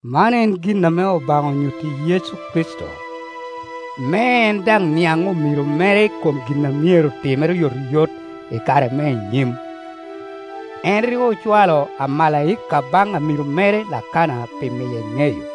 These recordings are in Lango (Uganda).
Man en gin ame Obaŋa onyutti Yecu Kricito, me en daŋ niaŋ omiro mere i kom gin a myero timere oyotoyot i kare me i nyim. En rik ocwalo amalaika baŋ amiro mere Lakana pi miye ŋeyo,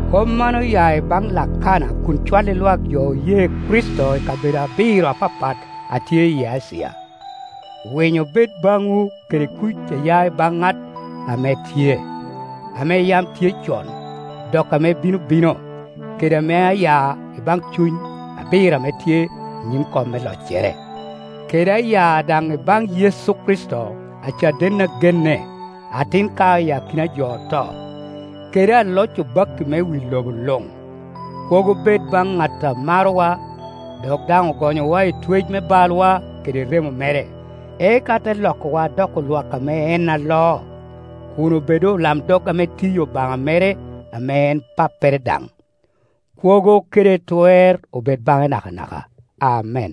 Kop man oya i baŋ Lakana kun cwalli lwak jo oye Kricito i kabedo abiro apapat a tye i Acia; Winyo bed baŋwu kede kuc a ya i baŋ ŋat ame tye, ame yam tye con, dok ame bino bino, kede ame a ya i baŋ cuny abiro ame tye i nyim kom me loccere, kede a ya daŋ i baŋ Yecu Kricito, acaden a genne, atin kao i akina jo oto, kede aloc obakki me wi lobo luŋ. Kwogo bed baŋ ŋat a marowa, dok daŋ ogonyowa i twec me balwa kede remo mere, eka te lokowa doko lwak ame en aloo, kun obedo olamdog ame tiyi Obaŋa mere ame en Pappere daŋ. Kwogo kede twer obed baŋe nakanaka. Amen.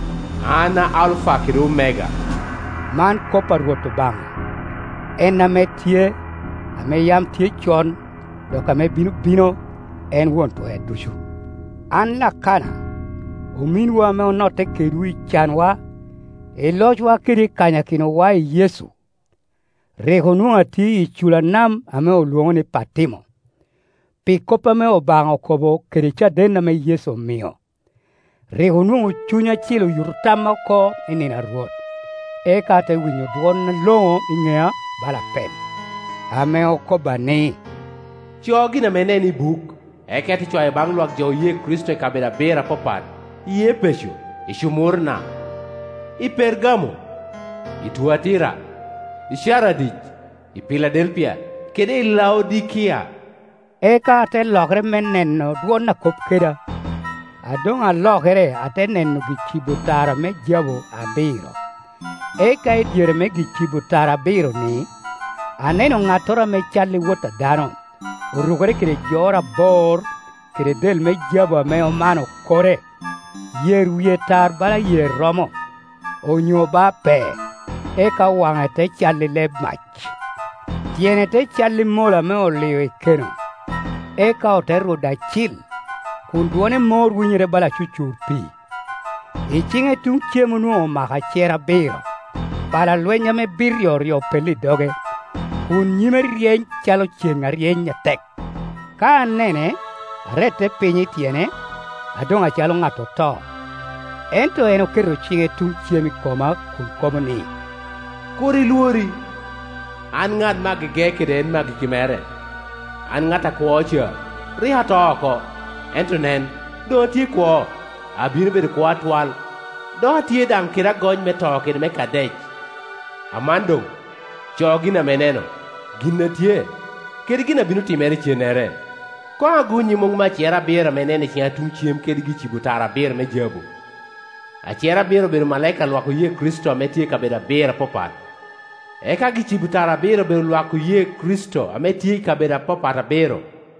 “An Alufa kede Omega,” man kop a Rwot Obaŋa, en ame tye, ame yam tye con, dok ame bino bino, en Won Twer Ducu. An Lakana, ominwu ame onotte kedwu i canwa, i locwa kede i kanyakinowa i Yecu. Rik onwoŋo atye i icula nam ame olwoŋo ni Pati mo, pi kop ame Obaŋa okobo kede caden ame Yecu omio. Rik onwoŋo Cuny Acil oyuto tamma oko i nino a Rwot, eka ate winyo dwon aloŋo i ŋea bala apel ame okobba ni, “Co gin ame ineno i buk, eka ite cwayo baŋ lwak jo oye Kricito i kabedo abiro apapat, i Epeco, i Cumurna, i Pergamo, i Tuatira, i Caradic, i Piladelpia kede i Laodikia,” Eka ate lokere me neno dwon a kop keda, A doŋ alokere ate neno gicibo tara me jabu abiro, eka i dyere me gi-cibo tara abiro-ni, aneno ŋattoro ame cal i wot a dano. Orukere kede jor abor, kede del me Jabu ame omano kore. Yer wie tar bala yer romo, onyo ba pee, eka waŋe te cal i leb mac, tyene te cal i mola ame olio i keno, eka ote rudo acil, kun dwone mor winyere bala acucur pii. I ciŋe tuŋ cem onwoŋo omako acer abiro, pala lweny ame bit ryoryo opello i doge, kun nyime ryeny calo ceŋ a ryeny atek. Ka anane, arette piny i tyene, adoŋ acalo ŋat oto. Ento en oketo ciŋe tuŋ cem i koma kun kobo ni, “Kur ilwori; an ŋat me agege kede en me agikki mere, an ŋat akwo ca. Rik ata oko, ento nen, doŋ atye kwo, abino bedo kwo atwal. Dok atye daŋ kede agony me To kede me Kadec. Aman doŋ, co gin ame ineno, gin a tye, kede gin a bino timere icennere. Koŋ agonnyi muŋ me acer abiro ame ineno i ciŋa tuŋ cem kede gi-cibo tara abiro me jabu. Acer abiro obedo omalaika a lwak oye Kricito ame tye i kabedo abiro apapat, eka gi-cibo tara abiro obedo lwak oye Kricito ame tye i kabedo apapat abiro.